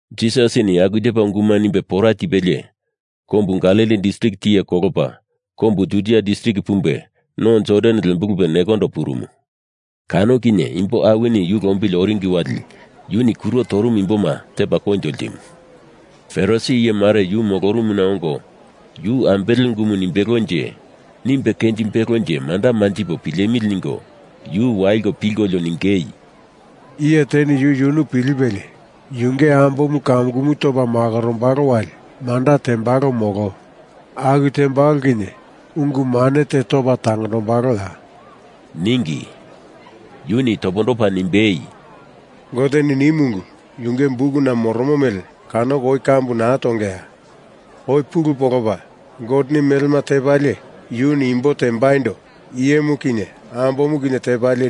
Jisasini aku tepa unguma nimbe pora tipelie, kombu Galili distrik tiye kolopa kombu Judia distrik pumbe no Jordan lembulupe nekondo purumu. Kano kinye imbo awini yu lombili oringi wali yuni kuro torumu imboma tepa koinjo ltimu. Farisi iye mare yu molorumuna ongo yu ambele ungumu nimbelonje, nimbe kenjimbelonje manda manjipo pilemili ningo yu waliko pilkolio ningei, “Iye teni yu yunu pilipelie yunge ambomu kamukumu topa makorombalo wali manda tembalo molo aku tembalo kinye ungu mane te topa tangondombaloya?” ningi. Yuni topondopa nimbei, “Goteni nimu ungu yunge bukuna moromo mele kanoko oi kambu naa tongeya? Oi pulu polopa, Goteni melema tepalie, yuni imbo tembaindo iyemu kinye ambomu kinye tepalie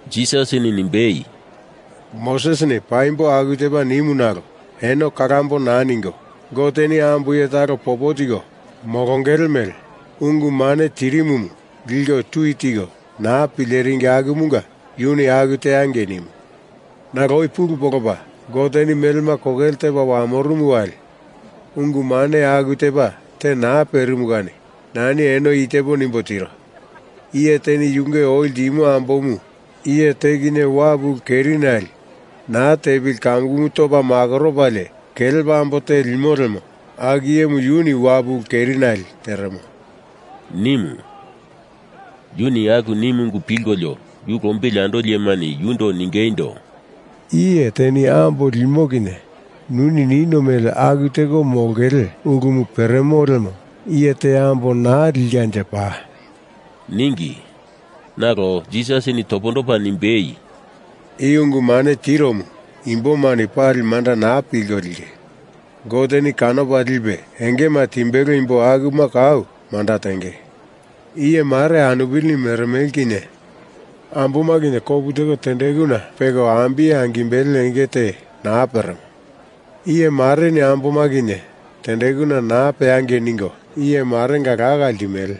Jisasini nimbei, “Mosesini paimbo aku tepa nimu nalo eno kalambo naa ningo Goteni ambo iye talo popo tiko molongele mele ungu mane tirimumu liko tui tiko naa pileringi akumunga yuni aku teangei nimu. Nalo oi pulu polopa, Goteni melema kokele tepa wamorumu wali, ungu mane aku tepa te naa perimu kani nani eno i tepo nimbo tiro. Iye teni yunge oi ltimo ambomu iye te kinye wapu ulu kerinale naa tepili kamukumu topa makoropalie kelepa ambo te limo lemo aku iyemu yuni wapu ulu kerinale teremo,” nimu. Yuni aku nimu ungu pilkolio yu lombili andoli iyemani yundo ningeindo, “Iye teni ambo limo kinye nuni nino mele aku teko molongele ulumu peremo lemo iye te ambo naa likanje paa,” ningi. Nalo Jisasini topondopa nimbei, “I ungu mane tiromu imbomani pali manda naa pilko linge. Goteni kanopa lipe engema timbelo imbo akuma kau manda tenge. Iye mare anupilini meremele kinye amboma kinye tendekuna kopu teko peko ambiye angimbele enge te naa peremo. Iye mareni amboma kinye tendekuna naa peangei ningo iye marenga laka ltimele.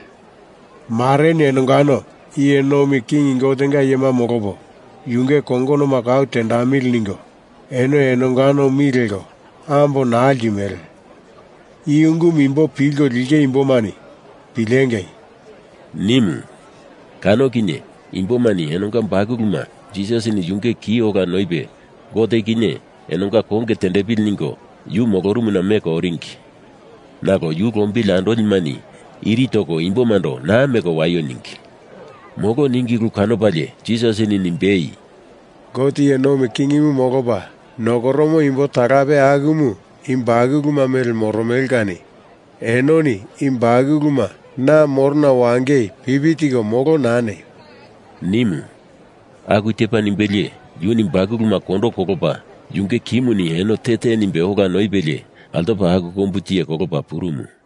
Mareni enongano iye nomi king Gotenga iyema molopo yunge kongonoma kau tendamili ningo eno enongano mi leko ambo naa ltimele. I ungumu imbo pilko linge imbomani pilengei!” nimu. Kano kinye imbomani enonga bakuluma Jisas yunge ki ola noipe Gote kinye enonga konge tendepili ningo yu molorumuna meko oringi. Nalo yu lombili andolimani iri toko imbomando naa meko waio ningi. Molo ningi ulu kanopalie Jisasini nimbei, “Gote iye nomi kingimu molopa nokoromo imbo talape akumu i bakuluma mele moromele kani enoni i bakuluma na morona wangei pipi tiko molo naa neio,” nimu. Aku tepa nimbelie yuni bakuluma kondo kolopa yunge kimuni eno te te nimbe ola noipelie altopa aku kombu tiye kolopa purumu.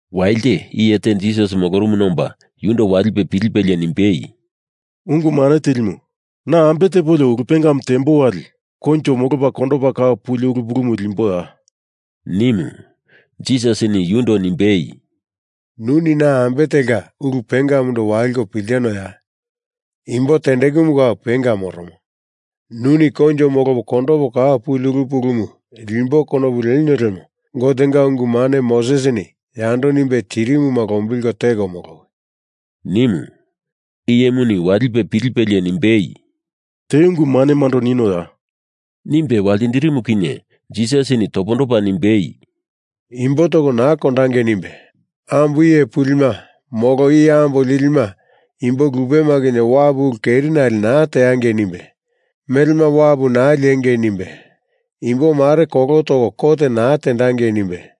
Walite iye te Jisas molorumuna omba yundo walipe pilipelie nimbei, “Ungu Mane Tilimu, na ambe tepolio ulu pengamu tembo wali koinjo molopa kondopa kau puli ulu pulumu limboya?” nimu. Jisasini yundo nimbei, “Nuni na ambe telka ulu pengamundo waliko piltinoya? Imbo tendekumu kau penga moromo. Nuni koinjo molopo kondopo kau puli ulu pulumu limbo konopu lenio lemo Gotenga ungu mane Mosesini yando nimbe tirimuma lombilko teko molowi,” nimu. Iyemuni walipe pilipelie nimbei, “Te ungu manemando ninoya?” nimbe waltindirimu kinye Jisasini topondopa nimbei, “Imbo toko naa kondangei nimbe, ambo iye pulima molo iye ambo lilima imbo lupema kinye wapu ulu kerinale naa teangei nimbe, melema wapu naa liengei nimbe, imbomare kolo toko kot naa tendangei nimbe,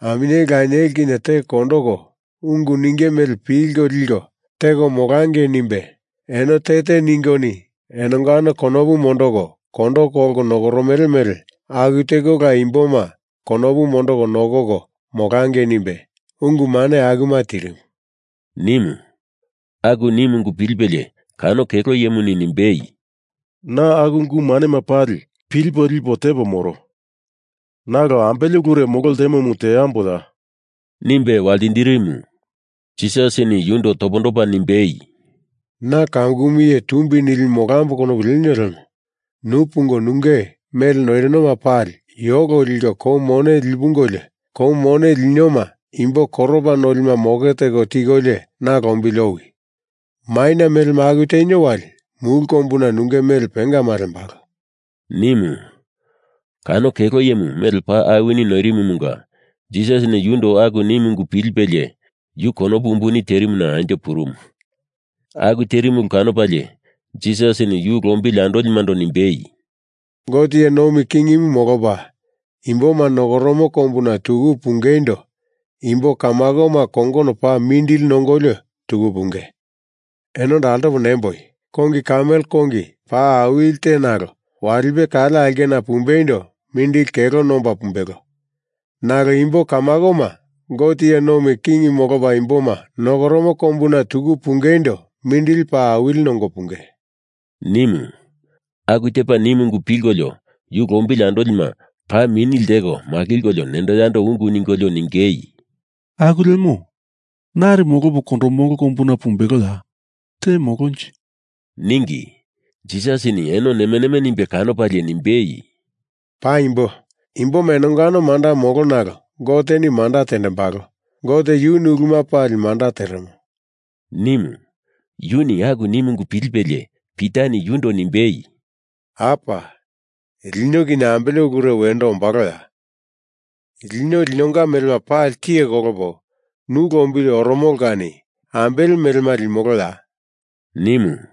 aminyeli lanieli kinye teko kondoko ungu ninge mele pilko liko teko molangei nimbe, eno te te ningoni enongano konopu mondoko kondo kolko nokoromele mele aku tekola imboma konopu mondoko nokoko molangei nimbe, ungu mane akuma tirimu,” nimu. Aku nimu ungu pilipelie kano kelo iyemuni nimbei, “Na aku ungu manema pali pilipo lipo tepo moro. Nalo ambele ulure molo ltemomu teamboya?” nimbe waltindirimu. Jisasini yundo topondopa nimbei, “Na kamukumu iye tumbi nilimu molambo konopu lenio lemo nu pungo nunge mele noirinoma pali yolo liko kou mone lipungolio, kou mone linioma imbo koropa nolima moke teko tikolio na lombili owi. Maina melema aku tenio wali mulu kombuna nunge mele pengama lembalo,” nimu. Kano kelo iyemu mele paa awini noirimumunga Jisasini yundo aku nimu ungu pilipelie yu konopu umbuni terimuna anjo purumu. Aku terimu ulu kanopalie Jisasini yu lombili andolimando nimbei, “Gote iye nomi king molopa imboma nokoromo kombuna tuku pungeindo imbo kamakoma kongono paa mindili nongolio tuku punge. Enondo altopo nimboi, kongi kamel kongi paa awili te nalo walipe kale aulkena pumbeindo mindili kelo nomba pumbelo. Nalo imbo kamakoma Gote iye nomi king molopa imboma nokoromo kombuna tuku pungeindo mindili paa awili nongo punge,” nimu. Aku tepa nimu ungu pilkolio yu lombili andolima paa mini lteko makilkolio nendo yando ungu ningolio ningei, “Aku lemo, nari molopo kondomolo kombuna pumbeloya? Te molonje,” ningi. Jisasini eno neme neme nimbe kanopalie nimbei, “Paimbo, imboma enongano manda molo nalo Goteni manda tendembalo. Gote yuni uluma pali manda teremo,” nimu. Yuni aku nimu ungu pilipelie Pitani yundo nimbei, “Apa, lino kinye ambele ulure wendo ombaloya? Lino linonga melema pali tiye kolopo nu lombili oromolo kani ambele melema limoloya?” nimu.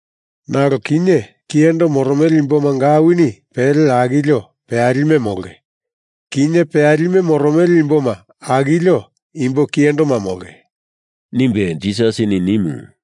Nalo kinye kiyendo moromele imbomanga awini pele akilio peyalime molonge. Kinye peyalime moromele imboma akilio imbo kiyendoma molonge,” nimbe Jisasini nimu.